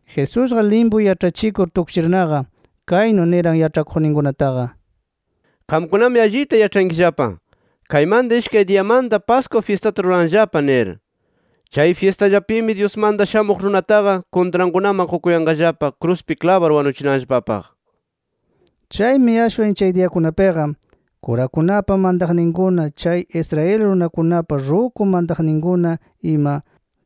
Jesusqa limpu yaĉhachikur tukchirnaqa, kaynu niran yaĉhakuqninkunataqa: “Qamkunami allita yaĉhankillapa, kaymanta ishkay diyamanta Pascua fyistata ruranllapa nir. Chay fyistallapimi Dyusmanta Shamuq Runataqa kuntrankunaman qukukayanqallapa kruspi klabar wanuchinanllapapaq”. Chaymi ashwan chay diyakunapiqa, kurakunapa mantaqninkuna, chay Israel runakunapa ruku mantakuqninkuna ima,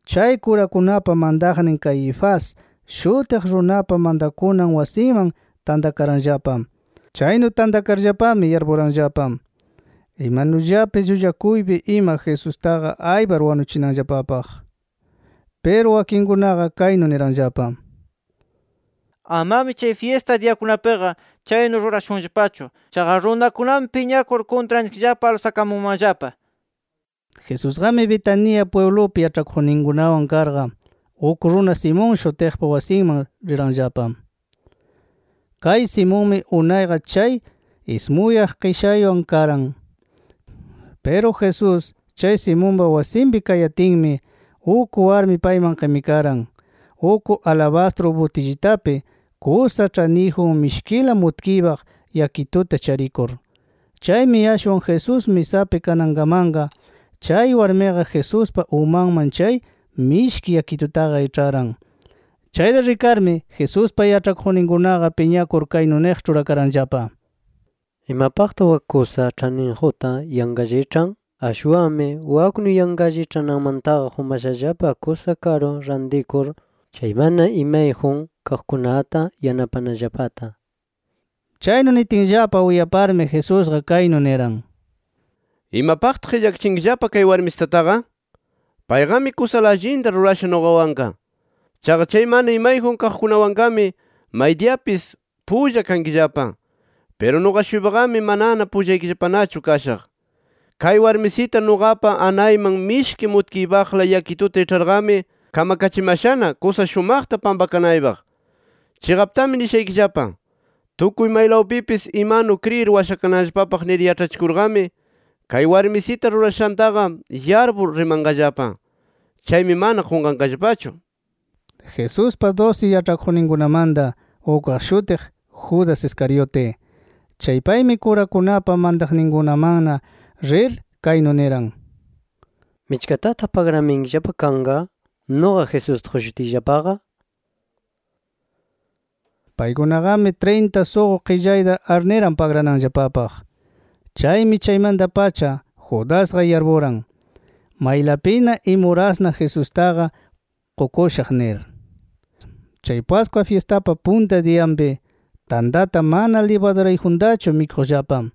chay kurakunapa mantaqnin Caifás shutiq runapa mantakunan wasinman tantakaranllapa. Chaynu tantakarllapami yarpuranllapa, imanullapis llullakuypi ima Jesustaqa aypar wanuchinanllapapaq. Piru wakinkunaqa kaynu niranllapa: “Amami chay fyista diyakunapiqa chaynu rurashunllapachu. Chaqa runakunami piñakur kuntranchikllapa alsakamunmanllapa” nir. Jesusqami Betania pwiblupi yaĉhakuqninkunawan karqa, uk runa Simón shutiqpa wasinman riranllapa. Kay Simonmi unayqa chay ismuyaq qishaywan karan. Piru Jesús chay Simonpa wasinpi kayatinmi, uk warmi payman qimikaran uk alabastru butillitapi kusa ĉhaniyjun mishkila mutkiypaq yakituta charikur. Chaymi ashwan Jesús misapi kanankamanqa, chay warmiqa Jesuspa umanman chay mishki yakitutaqa iĉharan. Chayta rikarmi Jesuspa yaĉhakuqninkunaqa piñakur kaynu niq ĉhurakaranllapa: —¿Imapaqtaq wak kusa ĉhaniyjunta yanqallaqa iĉhan? Ashwanmi waknu yanqalla iĉhananmantaqa qumashallapa kusa karu rantikur, chay mana imayjun kaqkunata yanapanallapata nir. Chaynu nitinllapa uyaparmi Jesusqa kaynu niran: —¿Imapaqtaq qillakachinkillapa kay warmisitataqa? Payqami kusala allinta rurasha nuqawanqa. Chaqa chay mana imayjun kaqkunawanqami maydiyapis pulla kankillapa. Piru nuqa-shuypaqami manana pullaykillapanachu kashaq. Kay warmisita nuqapa anayman mishki mutkiypaqla yakituta iĉharqami, kamakachimashana, kusa shumaqta pampakanaypaq. Chiqaptami nishaykillapa: Tukuy maylawpipis imanu kriyir washakananllapapaq nir yaĉhachikurqami, kay warmisita rurashantaqa yarpur rimanqallapa. Chaymi mana qunqanqallapachu. Jesuspa dusi yaĉhakuqninkunamanta ukqa shutiq, Judas Iscariote. Chay paymi, kurakunapa mantaqninkunamanna rir, kaynu niran: —¿Michkatataq pagramayankillapa kanqa nuqa, Jesusta qushutiyllapaqa? nir. Paykunaqami trinta suqu qillayta arniran pagrananllapapaq. Chaymi chaymanta-pacha, Judasqa yarpuran maylapina, imurasna Jesustaqa qukushaq nir. Chay Pascua fyistapa punta diyanpi, tantata mana libadurayjuntachu mikuqllapa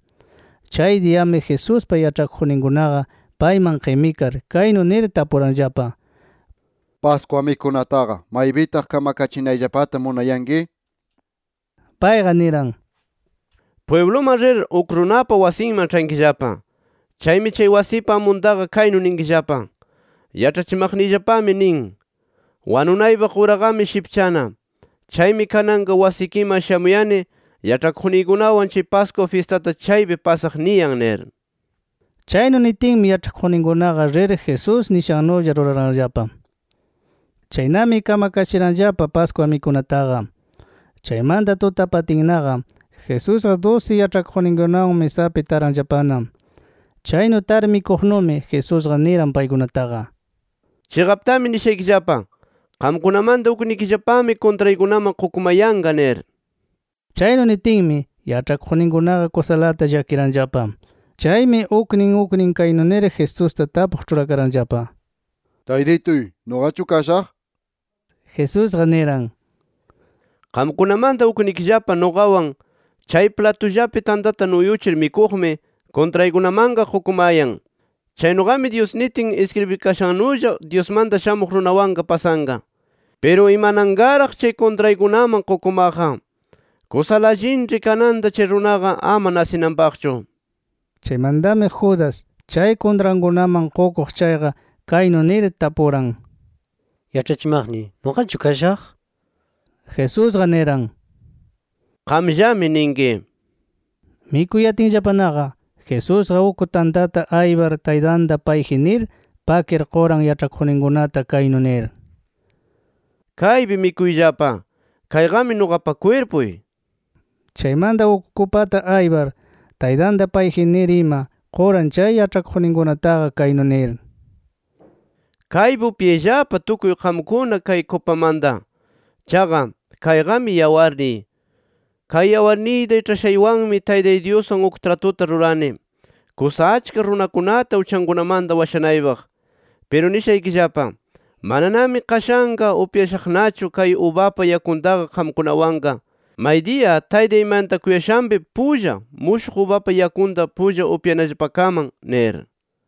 chay diyami Jesuspa yaĉhakuqninkunaqa payman qimikar kaynu nir tapuranllapa: —Pascua mikunataqa, ¿maypitaq kamakachinayllapata munayanki? nir. Payqa niran: —Pwibluman rir uk runapa wasinman ĉhankillapa. Chaymi chay wasipa amuntaqa kaynu ninkillapa: ‘Yaĉhachimaqniyllapami nin: Wanunaypaq uraqami shipchana. Chaymi kananqa wasikiman shamuyani yaĉhakuqniykunawan chay Pascua fyistata chaypi pasaq niyan nir’. Chaynu nitinmi yaĉhakuqninkunaqa Jesús nishannulla rir ruraranllapa. Chaynami kamakachiranllapa Pascua mikunataqa. Chaymanta tutapatinnaqa, Jesusqa dusi yaĉhakuqninkunawan misapi taranllapana. Chaynu tar mikuqnumi Jesusqa niran paykunataqa: —Chiqaptami nishaykillapa: Qamkunamanta uknikillapami kuntraykunaman qukumayanqa nir. Chaynu nitinmi, yaĉhakuqninkunaqa kusalata llakiranllapa. Chaymi uknin uknin kaynu nir Jesusta tapuq ĉhurakaranllapa: —Taytituy ¿nuqachu kashaq? nir. Jesusqa niran: —Qamkunamanta uknikillapa nuqawan chay platullapi tantata nuyuchir mikuqmi, kuntraykunamanqa qukumayan. Chaynuqami Dyus nitin iskribikashannulla, Dyusmanta Shamuq Runawanqa pasanqa. ¡Piru imananqaraq, chay kuntraykunaman qukumaqqa! Kusala allinĉhi kananta chay runaqa ama nasinanpaqchu. Chaymantami Judas, chay kuntrankunaman qukuq chayqa, kaynu nir tapuran: —Yaĉhachimaqniy ¿nuqachu kashaq? nir. Jesusqa niran: —Qamllami ninki. Mikuyatinllapanaqa, Jesusqa uk tantata aypar Taytanta payji nir, pakir quran yaĉhakuqninkunata kaynu nir: “Kaypi mikuyllapa. Kayqami nuqapa kwirpuy” nir. Chaymanta uk kupata aypar Taytanta payji nir ima, quran chay yaĉhakuqninkunataqa kaynu nir: “Kaypi upyayllapa tukuy qamkuna kay kupamanta. Chaqa, kayqami yawarniy. Kay yawarniyta iĉhashaywanmi Taytay Dyuswan uk tratuta rurani, kusa achka runakunata uchankunamanta washanaypaq. Piru nishaykillapa: Mananami qashanqa upyashaqnachu kay ubapa yakuntaqa qamkunawanqa, maydiya Taytay mantakuyashanpi pulla mushuq ubapa yakunta pulla upyanallapakaman” nir.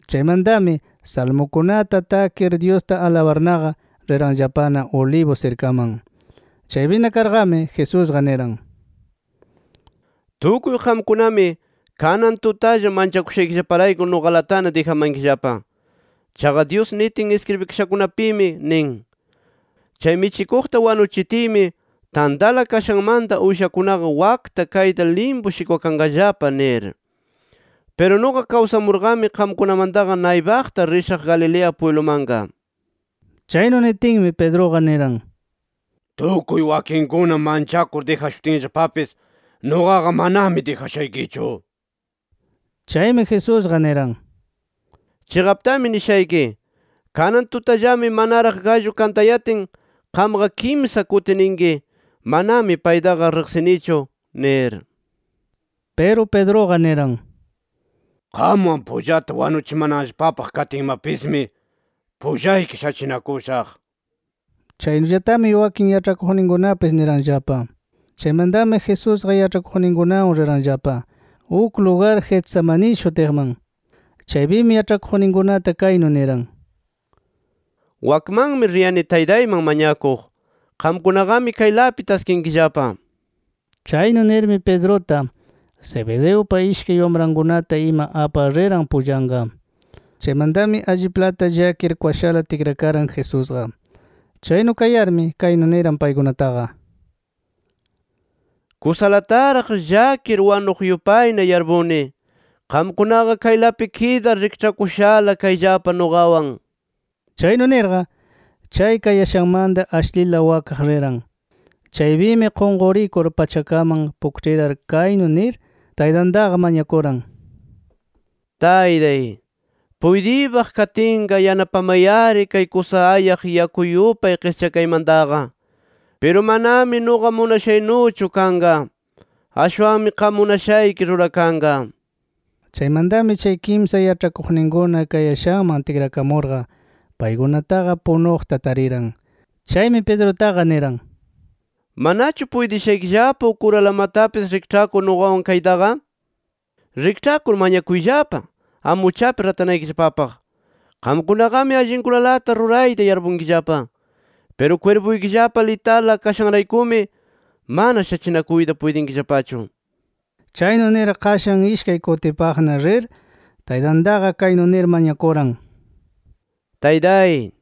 Chaymantami salmukunata takir Dyusta alabarnaqa, riranllapana Olivos sirkaman. Chaypina karqami Jesusqa niran: —Tukuy qamkunami, kanan tutalla manchakushaykillaparayku nuqalatana dijamankillapa. Chaqa Dyus nitin iskribikashakunapimi nin: ‘Chay michikuqta wanuchitiymi, tantala kashanmanta uyshakunaqa wakta kayta limpu shikwakanqallapa’ nir. Piru nuqa kawsamurqami, qamkunamantaqa naypaqta rishaq Galilea pwiblumanqa. Chaynu nitinmi, Pedruqa niran: —Tukuy wakinkuna manchakur dijashutinllapapis, nuqaqa manami dijashaykichu nir. Chaymi Jesusqa niran: —Chiqaptami nishayki: Kanan tutallami manaraq gallu kantayatin qamqa kimsa kuti ninki: ‘Manami paytaqa riqsinichu’ nir. Piru Pedruqa niran: —Qamwan pullata wanuchimanallapapaq katinmapismi, pullayki shachinakushaq nir. Chaynullatami wakin yaĉhakuqninkunapis niranllapa. Chaymantami Jesusqa yaĉhakuqninkunawan riranllapa uk lugar Getsemaní shutiqman. Chaypimi yaĉhakuqninkunata kaynu niran: “Wakmanmi riyani Taytayman mañakuq. Qamkunaqami kaylapi taskinkillapa” nir. Chaynu nirmi Pedruta, Zebedeupa ishkay wamrankunata ima apar riran pullanqa. Chaymantami alliplata llakir kwashala tikrakaran Jesusqa. Chaynu kayarmi kaynu niran paykunataqa: “Kusalataraq llakir wanuq yupayna yarpuni. Qamkunaqa kaylapi kidar rikĉhakushala kayllapa nuqawan” nir. Chaynu nirqa, chay kayashanmanta ashlila wakaq riran. Chaypimi qunqurikur pachakaman pukĉhirar kaynu nir Taytantaqa mañakuran: “Taytay, puytiypaq katinqa yanapamay-ari kay kusa ayaq yaku yupay qischakaymantaqa. Piru manami nuqa munashaynuchu kanqa. Ashwanmi qam munashayki rurakanqa” nir. Chaymantami chay kimsa yaĉhakuqninkuna kayashanman tikrakamurqa, paykunataqa punuqta tariran. Chaymi Pedrutaqa niran: “¿Manachu puytishaykillapa uk uralamatapis rikĉhakur nuqawan kaytaqa? Rikĉhakur mañakuyllapa, ama uchapi ratanaykillapapaq. Qamkunaqami allinkunalata rurayta yarpunkillapa. Piru kwirpuykillapa litala kashanraykumi mana shachinakuyta puytinkillapachu”. Chaynu nir qashan ishkay kutipaqna rir, Taytantaqa kaynu nir mañakuran: “Taytay,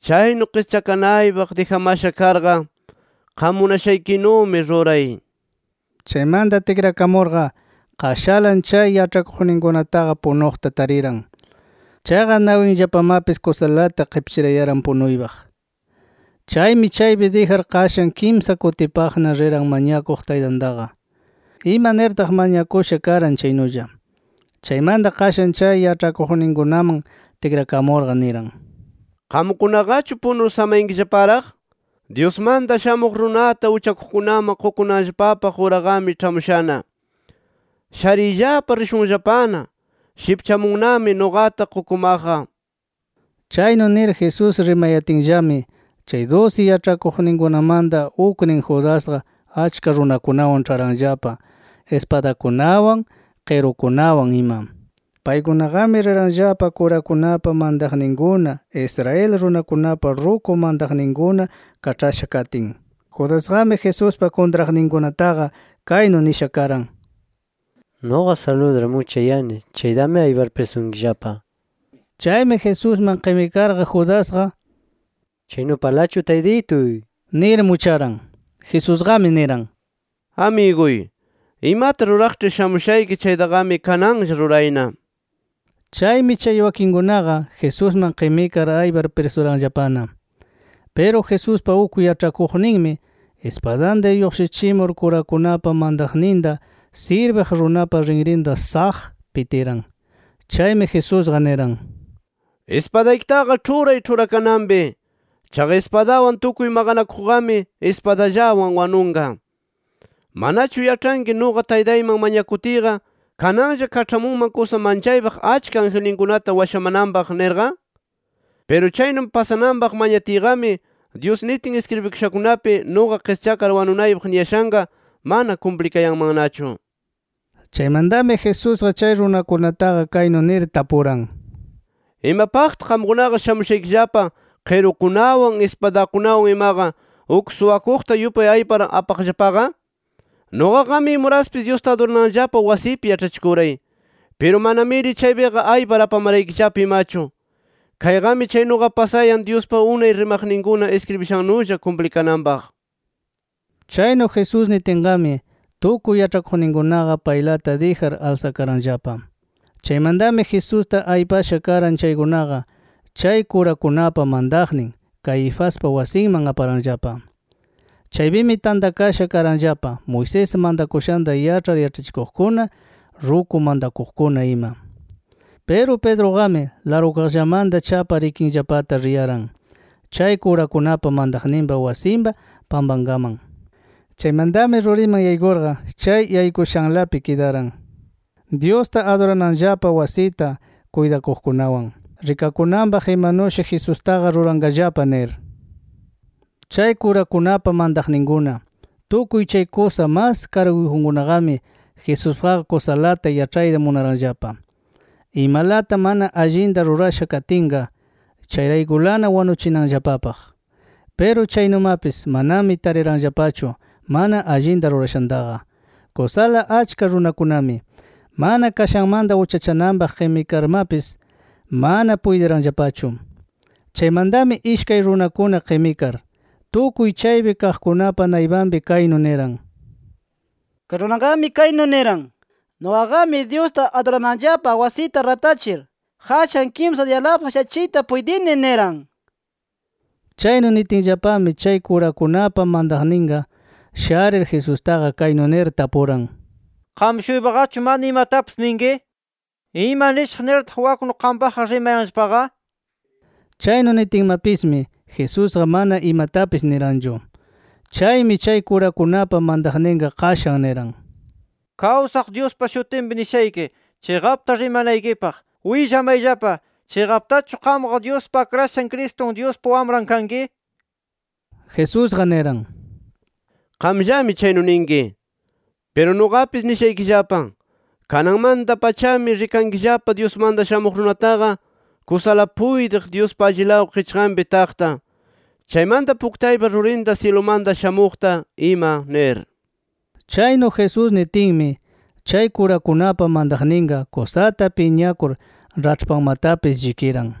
chaynu qischakanaypaq dijamasha karqa, qam munashaykinumi ruray” nir. Chaymanta tikrakamurqa, qashalan chay yaĉhakuqninkunataqa punuqta tariran. Chaqa nawinllapamapis kusalata qipchirayaran punuypaq. Chaymi chaypi dijar qashan kimsa kutipaqna riran mañakuq Taytantaqa, ima nirtaq mañakusha karan chaynulla. Chaymanta qashan chay yaĉhakuqninkunaman tikrakamurqa niran: “¿Qamkunaqachu punur samayankillaparaq? Dyusmanta Shamuq Runata uchakuqkunaman qukunanllapapaq uraqami ĉhamushana. Shariyllapa, rishunllapana, shipchamunnami nuqata qukumaqqa” nir. Chaynu nir Jesús rimayatinllami, chay dusi yaĉhakuqninkunamanta uknin Judasqa, achka runakunawan ĉharanllapa ispadakunawan, qirukunawan ima. Paykunaqami riranllapa kurakunapa mantaqninkuna, Israel runakunapa ruku mantakuqninkuna kaĉhasha katin. Judasqami, Jesuspa kuntraqninkunataqa, kaynu nisha karan: “Nuqa saludar muchayani chaytami aypar prisunkillapa” nir. Chaymi Jesusman qimikarqa Judasqa, —¡Chaynupalachu, Taytituy!— nir mucharan. Jesusqami niran: —Amiguy, imata ruraqĉhi shamushayki chaytaqami kananlla rurayna nir. Chaymi chay wakinkunaqa Jesusman qimikar aypar prisuranllapana. Piru Jesuspa uk yaĉhakuqninmi ispadanta lluqshichimur kurakunapa mantaqninta sirbiq runapa rinrinta ¡saq! pitiran. Chaymi Jesusqa niran: —Ispadaykitaqa ĉhuray ĉhurakananpi. Chaqa ispadawan tukuy maqanakuqqami, ispadallawan wanunqa nir. ¿Manachu yaĉhanki nuqa Taytayman mañakutiyqa, kananlla kaĉhamunman kusa manchaypaq achka angelninkunata washamananpaq nirqa? Piru chaynu pasananpaq mañatiyqami, Dyus nitin iskribikashankunapi, nuqa qischakar wanunaypaq niyashanqa mana kumplikayanmannachu. Chaymantami Jesusqa chay runakunataqa kaynu nir tapuran: —¿Imapaqtaq qamkunaqa shamushaykillapa qirukunawan ispadakunawan imaqa, uk suwakuqta yupay aypar apamaqllapaqa? Nuqaqami imuraspis Dyusta adurananllapa wasipi yaĉhachikuray. Piru manamiri chaypiqa aypar apamaraykillapa imachu. Kayqami chaynuqa pasayan Dyuspa unay rimaqninkuna iskribishannulla kumplikananpaq. Chaynu Jesús nitinqami, tukuy yaĉhakuqninkunaqa paylata dijar alsakaranllapa. Chaymantami Jesusta aypasha karan chaykunaqa, chay kurakunapa mantaqnin Caifaspa wasinman aparanllapa. Chaypimi tantakasha karanllapa Moisés mantakushanta yaĉhar yaĉhachikuqkuna, ruku mantakuqkuna ima. Piru Pedruqami largukaqllamanta chapar ikinllapata riyaran, chay kurakunapa mantaqninpa wasinpa pampankaman. Chaymantami ruriman yaykurqa, chay yaykushanlapi kidaran Dyusta adurananllapa wasita kuytaqkunawan, rikakunanpaq imanushi Jesustaqa ruranqallapa nir. Chay kurakunapa mantaqninkuna, tukuy chay kusa mas karguyjunkunaqami Jesuspaqqa kusalata yaĉhayta munaranllapa imalata mana allinta rurasha katinqa, chayraykulana wanuchinanllapapaq. Piru chaynumapis manami tariranllapachu mana allinta rurashantaqa. Kusala achka runakunami, mana kashanmanta uchachananpaq qimikarmapis mana puytiranllapachu. Chaymantami ishkay runakuna qimikar, tukuy chaypi kaqkunapa naypanpi kaynu niran: “Kay runaqami kaynu niran: ‘Nuqaqami Dyusta adurananllapa wasita ratachir, qashan kimsa diyalapaq shachiyta puytini niran’ nir”. Chaynu nitinllapami chay kurakunapa mantaqninqa sharir Jesustaqa kaynu nir tapuran: —¿Qam-shuypaqachu mana imatapis ninki? ¿Ima nishaq nirtaq waknu qampaqqa rimayanllapaqa? nir. Chaynu nitinmapismi Jesusqa mana imatapis niranchu. Chaymi chay kurakunapa mantaqninqa qashan niran: —Kawsaq Dyuspa shutinpi, nishayki chiqapta rimanaykipaq. Willamayllapa: ¿Chiqaptachu qamqa Dyuspa Akrashan Cristun, Dyuspa Wamran kanki? nir. Jesusqa niran: —Qamllami chaynu ninki. Piru, nuqapis nishaykillapa: Kananmanta-pachami rikankillapa Dyusmanta Shamuq Runataqa kusala puytiq Dyuspa allilaw qichqanpi taqta, chaymanta puktaypa rurinta syilumanta shamuqta ima nir. Chaynu Jesús nitinmi, chay kurakunapa mantaqninqa kusata piñakur raĉhpanmatapis llikiran,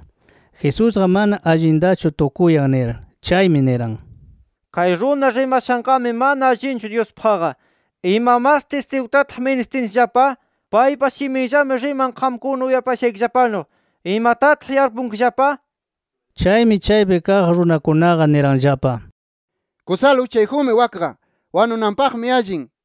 Jesusqa mana allintachu tukuyan nir. Chaymi niran: —¡Kay runa rimashanqami mana allinchu Dyuspaqqa! ¿Ima mas tistigutataq ministinchikllapa? Paypa shiminllami riman qamkuna uyapashaykillapanu. ¿Imatataq yarpunkillapa? Chaymi, chaypi kaq runakunaqa niranllapa: —Kusala uchayjunmi wakqa; wanunanpaqmi allin nir.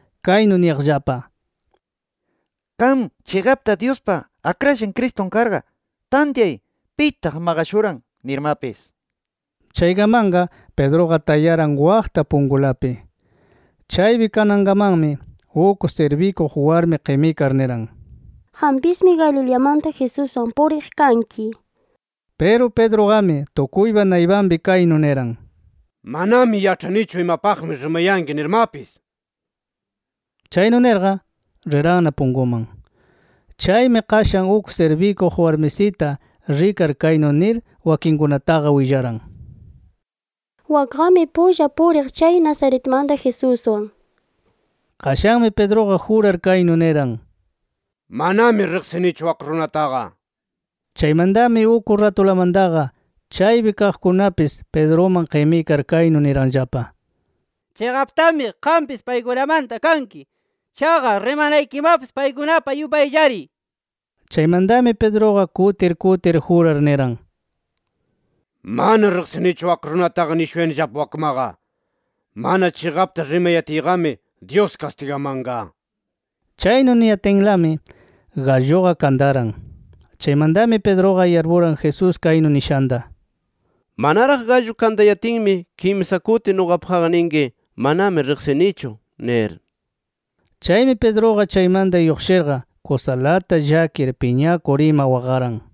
kaynu niyaqllapa: —¡Qam chiqapta Dyuspa Akrashan Cristun karqa, tantyay pitaq maqashuran! nirmapis. Chaykamanqa Pedruqa tayaran waqta punkulapi. Chaypi kanankamanmi uk sirbikuq warmi qimikar niran: —Qampismi Galileamanta Jesuswan puriq kanki nir. Piru Pedruqami tukuypa naypanpi kaynu niran: —Manami yaĉhanichu imapaqmi rimayanki nirmapis nir. Chaynu nirqa, riranna punkuman. Chaymi, qashan uk sirbikuq warmisita rikar, kaynu nir wakinkunataqa willaran: —Wakqami pulla puriq chay Nazaretmanta Jesuswan nir. Qashanmi Pedruqa jurar kaynu niran: —¡Manami riqsinichu wak runataqa! nir. Chaymantami uk ratulamantaqa chaypi kaqkunapis Pedruman qimikar kaynu niranllapa: —Chiqaptami qampis paykunamanta kanki. Chaqa, rimanaykimapis paykunapa yupayllari nir. Chaymantami Pedruqa kutir kutir jurar niran: —¡Mana riqsinichu wak runataqa nishuyanillapa wakmaqa! ¡Mana chiqapta rimayatiyqami Dyus kastigamanqa! nir. Chaynu niyatinlami galluqa kantaran. Chaymantami Pedruqa yarpuran Jesús kaynu nishanta: “Manaraq gallu kantayatinmi kimsa kuti nuqapaqqa ninki, manami riqsinichu nir”. Chaymi Pedruqa, chaymanta lluqshirqa kusalata llakir, piñakur ima waqaran.